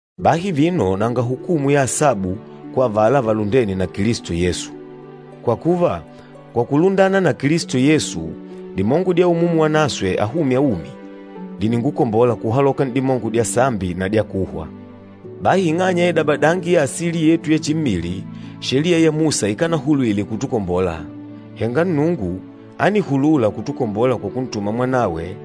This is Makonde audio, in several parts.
Bahi vino nanga hukumu ya asabu kwa avala valundêne na Kilisto Yesu. Kwa kuva, kwa kulundana na Kilisto Yesu, dimongo dya Umumu Wanaswe ahûmya umi, dìningukombola kuhaloka n'dimongo dya sambi na dya kuhwa. Bahi ing'anya ya idabadangi ya asili yetu ya chimmili, Sheliya ya Musa ikanahulwile kutukombola, henga Nnungu ánihulula kutukombola kwa kuntuma Mwanawe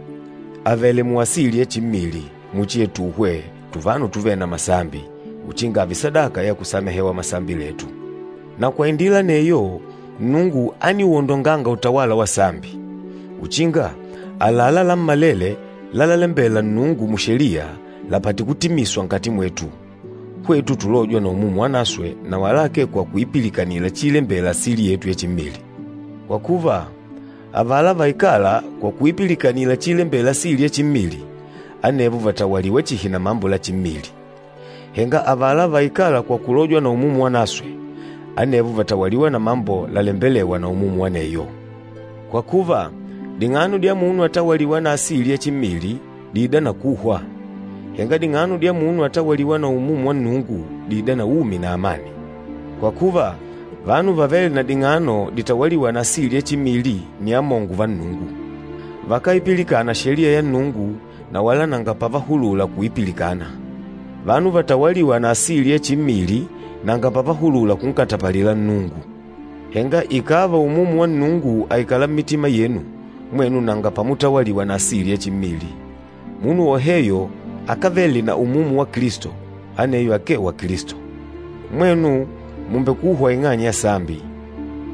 avèlè muasili ya chimmili muchi yatuhwe tuvanu tuvêle na masambi, uchinga ààve sadaka ya kusamehewa masambi letu. Na kwa indila aneyo, Nnungu ániuondonganga utawala wa sambi, uchinga àlalá lammalele lalalembela Nnungu mu Sheliya, lapate kutimiswa nkati mwetu, hwetu tulôjwa na Umumu Wanaswe, na wala akee kwa kuipilikanila chiilembela asili yetu ya chimmili. Kwa kuva, avala vaikâla kwa kuipilikanila chiilembela asili ya chimmili, anevo vàtawaliwa chihi na mambo la chimmili, henga avala vaikâla kwa kulojwa na Umumu Wanaswe, anevo vàtawaliwa na mambo lalembelêwa na Umumu aneyo. Kwa kuva, ding'ano dya munu atawalîwa na asili ya chimmili, dìida na kuhwa, henga ding'ano dya munu atawalîwa na Umumu wa Nnungu, dìida na umi na amani. Kwa kuva, vanu vavêle na ding'ano ditawalîwa na asili ya chimmili nni amongo va Nnungu, vakáipilikana Sheliya ya Nnungu na wala nanga pavahulula kuipilikana. Vanu vatawalîwa na asili ya chimmili nanga pavahulula kunkatapalila Nnungu. Henga ikàva Umumu wa Nnungu àikala mmitima yenu, mwenu nanga pamutawaliwa na asili ya chimmili. Munu woheyo akávele na Umumu wa Kilisto, aneyo akee wa Kilisto. Mwenu mùmbekuhwa ing'anya ya sambi,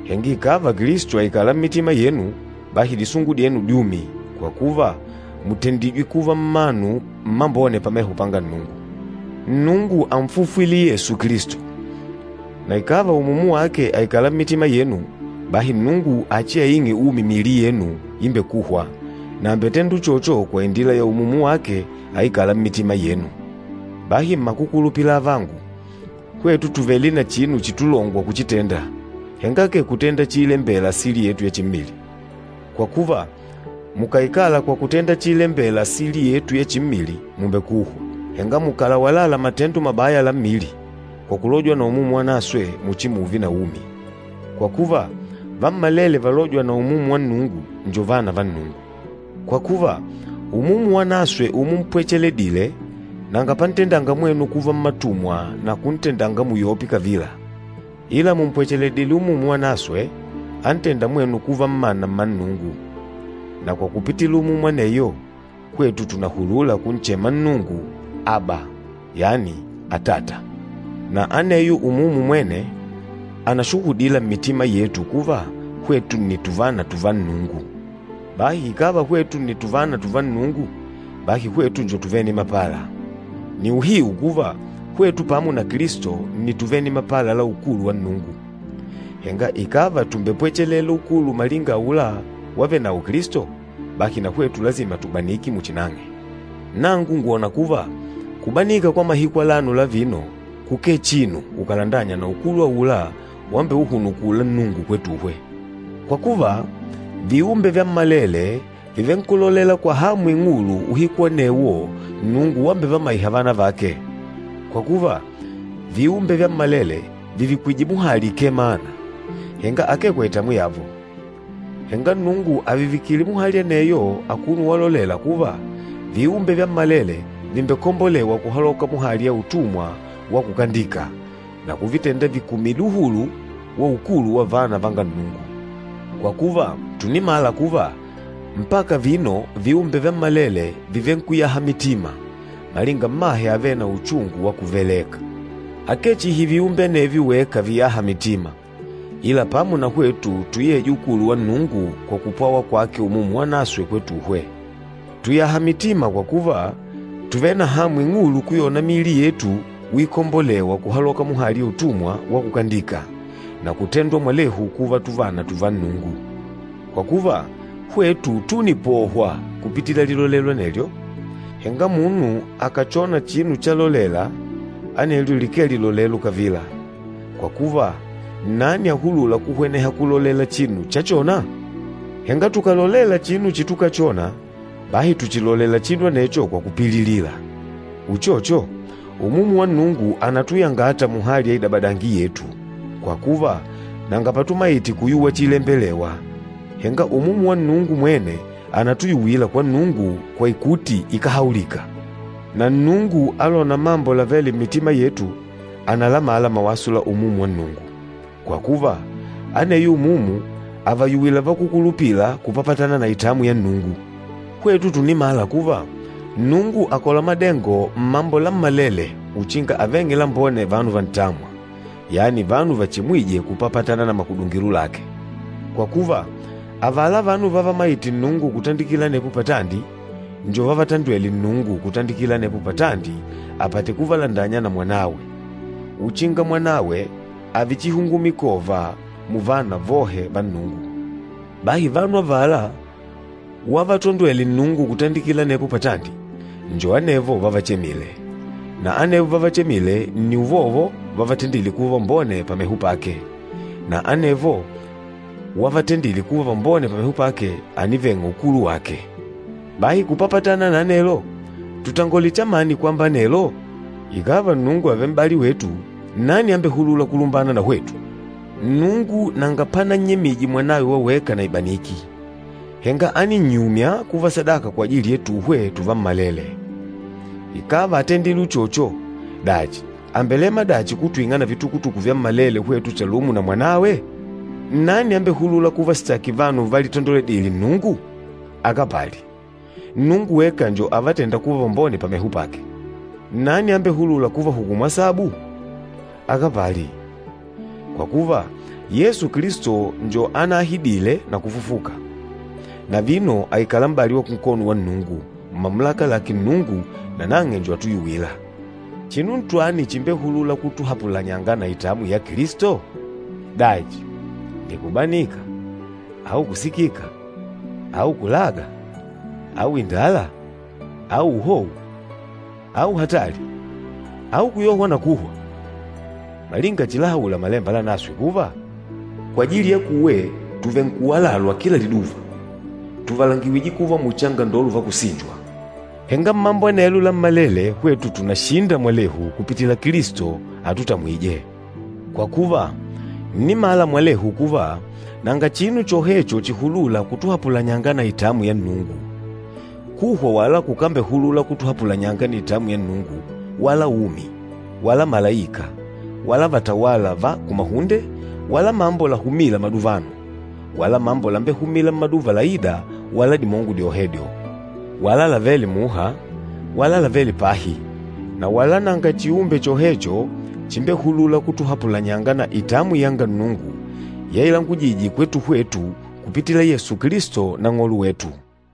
henga ikàva Kilisto àikala mmitima yenu, bahi disungu dyenu dyumi, kwa kuva mùtendijwe kuva mmanu mmambone pameho panga Nnungu. Nnungu ánfufwile Yesu Kilisto, na ikàva Umumu wake àikala mmitima yenu, bahi Nnungu achiaing'e umi miili yenu imbekûhwa, na àmbetenda uchocho kwa indila ya Umumu wake aikâla mmitima yenu. Bahi mmakukulupila avangu, hwetu tùvele na chinu chitulongwa kuchitenda, henga akee kutenda chiilembela asili yetu ya chimmili. Kwa kuva, mukàikala kwa kutenda chiilembela asili yetu ya chimmili, mùmbekuhwa, henga mukàlawalala matendo mabaya la mmili, kwa kulojwa na Umumu Wanaswe, muchimuve na umi. Kwa kuva, vammalele valôjwa na Umumu wa Nnungu njo vana va Nnungu. Kwa kuva, Umumu Wanaswe umumpwecheledile, nanga pantendanga mwenu kuva mmatumwa na kuntendanga muyope kavila, ila mùmpwecheledile Umumu Wanaswe antênda mwenu kuva mmana mma Nnungu. Na kwa kupitila Umumu aneyo, hwetu tùnahulula kunchema Nnungu, “Aba,” yani “Atata!” Na aneyo Umumu mwene, ànashuhudila mmitima yetu kuva hwetu nni tuvana tuva Nnungu. Bahi ikàva hwetu nni tuvana tuva Nnungu, bahi hwetu njo tuvene mapala. Ni uhiu kuva, hwetu pamo na Kilisto nni tuvene mapala la ukulu wa Nnungu. Henga ikàva tùmbepwechelela ukulu malinga aula wavenawo Kilisto, bahi na hwetu lasima tubanike muchi nang'e. Nangu ngwòna kuva kubanika kwa mahiku alano la vino kukee chinu ukàlandanya na ukulu aula wambeuhunukula Nnungu kwetuhwe. Kwa kuva, viumbe vyammalele vìvenkulolela kwa hamu ing'ulu uhiku anewo Nnungu wambevamaiha vana vake. Kwa kuva, viumbe vyammalele vìvikwije muhali ikemana, henga akee kwa itamwi yavo. Henga Nnungu àvivikile muhali aneyo akuno walolela kuva, viumbe vyammalele vìmbekombolewa kuhaloka muhali ya utumwa wa kukandika, na kuvitenda vikumile uhulu wa ukulu wa vana vanga Nnungu. Kwa kuva, tùnimala kuva, mpaka vino viumbe vyammalele vìvenkuyaha mitima, malinga mmahe avêle na uchungu wa kuveleka. Akee chihi viumbe anevyo weka viyâha mitima, ila pamo na hwetu tuyêja ukulu wa Nnungu kwa kupwawa kwake Umumu Wanaswe kwetuhwe. Tùyaha mitima kwa kuva, tùvele na hamu ing'ulu kuyona miili yetu uikombolewa kuhaloka muhali ya utumwa wa kukandika, na kutendwa mwalehu kuva tuvana tuva Nnungu. Kwa kuva, hwetu túnipohwa kupitila lilolelo anelyo. Henga munu akàchona chinu chalolela, anelyo likee lilolelo kavila, kwa kuva nnani ahulûla kuhweneha kulolela chinu chachona? Henga tukàlolela chinu chitukachona, bahi tùchilolela chinu anecho kwa kupililila. Uchocho, Umumu wa Nnungu ànatuyangata muhali ya idabadangi yetu, kwa kuva nanga patumaite kuyuwa chiilembelewa. Henga Umumu wa Nnungu mwene ànatuyuwila kwa Nnungu kwa ikuti ikáhaulika. Na Nnungu alôna mambo lavêle mmitima yetu, ànalamala mawaso la Umumu wa Nnungu, kwa kuva, aneyo Umumu àvayuwila vakúkulupila kupapatana na itamwi ya Nnungu. Hwetu tùnimala kuva, Nnungu àkola madengo mmambo lammalele uchinga aveng'e lambone vanu vantâmwa, yani vanu vachemwîje kupapatana na makudungilo lake. Kwa kuva, avala vanu vávamaìtè Nnungu kutandikila anepo patandi, njo vávatandwèlè Nnungu kutandikila anepo patandi apate kuvalandanya na Mwanawe, uchinga Mwanawe ààve chihungumikova muvana vohe va Nnungu. Bahi vanu avala wavatondwele Nnungu kutandikila anepo patandi, njo anevo wavachemile, na anevo wavachemile nni uvovo wavatendile kuva vambone pameho pake, na anevo wavatendile kuva vambone pameho pake, àniveng'a ukulu wake. Bahi kupapatana na anelo, tutangole chamani kwamba anelo? Ikàva Nnungu àvele m'bali wetu, nnani ambehulûla kulumbana na hwetu? Nnungu nanga panannyemije Mwanawe wa weka na ibaniki, henga áninnyumya kuva sadaka kwajili yetuhwe tuvammalele. Ikàva átendile uchocho, dachi àmbelema dachi kutwing'a na vitukutuku vyammalele, hwetu chalumo na Mwanawe? Nnani ambehulûla kuvasitaki vanu válitandoledìlè Nnungu? Akapali! Nnungu weka njo avatênda kuva vambone pameho pake. Nnani ambehulûla kuvahukumu asabu? Akapali! Kwa kuva, Yesu Kilisto njo anahidile na kufufuka, na vino àikala m'bali wa kunkono wa Nnungu, mumamulaka lake Nnungu, nanang'e njo atuyuwîla. Chinu ntwani chimbehulûla kutuhapulanyanga na itamwi ya Kilisto? Dachi, ni kubanika, au kusikika, au kulaga, au indala, au uhou, au hatali, au kuyohwa na kuhwa? Malinga chilahaula Malemba Lanaswe kuva, “Kwajili yakuwe tùvenkuwalalwa kila liduva, Tùvalangiwije kuva muchi angandolo va kusinjwa.” Henga mmambo anelo lammalele hwetu tùnashinda mwalehu kupitila Kilisto atutamwîje. Kwa kuva, ǹnimala mwalehu kuva, nanga chinu chohecho chihulûla kutuhapulanyanga na itamwi ya Nnungu. Kuhwa wala kukambehulula kutuhapulanyanga na itamwi ya Nnungu, wala umi, wala malaika, wala vatawâla va kumahunde, wala mambo lahumîla maduvano, wala mambo lambehumîla mmaduva laîda wala dimongo dyohedyo, wala lavêle muha, wala lavêle pahi, na wala nanga chiumbe chohecho chimbehulûla kutuhapulanyanga na itamwi yanga Nnungu yailangujije kwetu hwetu kupitila Yesu Kilisto Nang'olo wetu.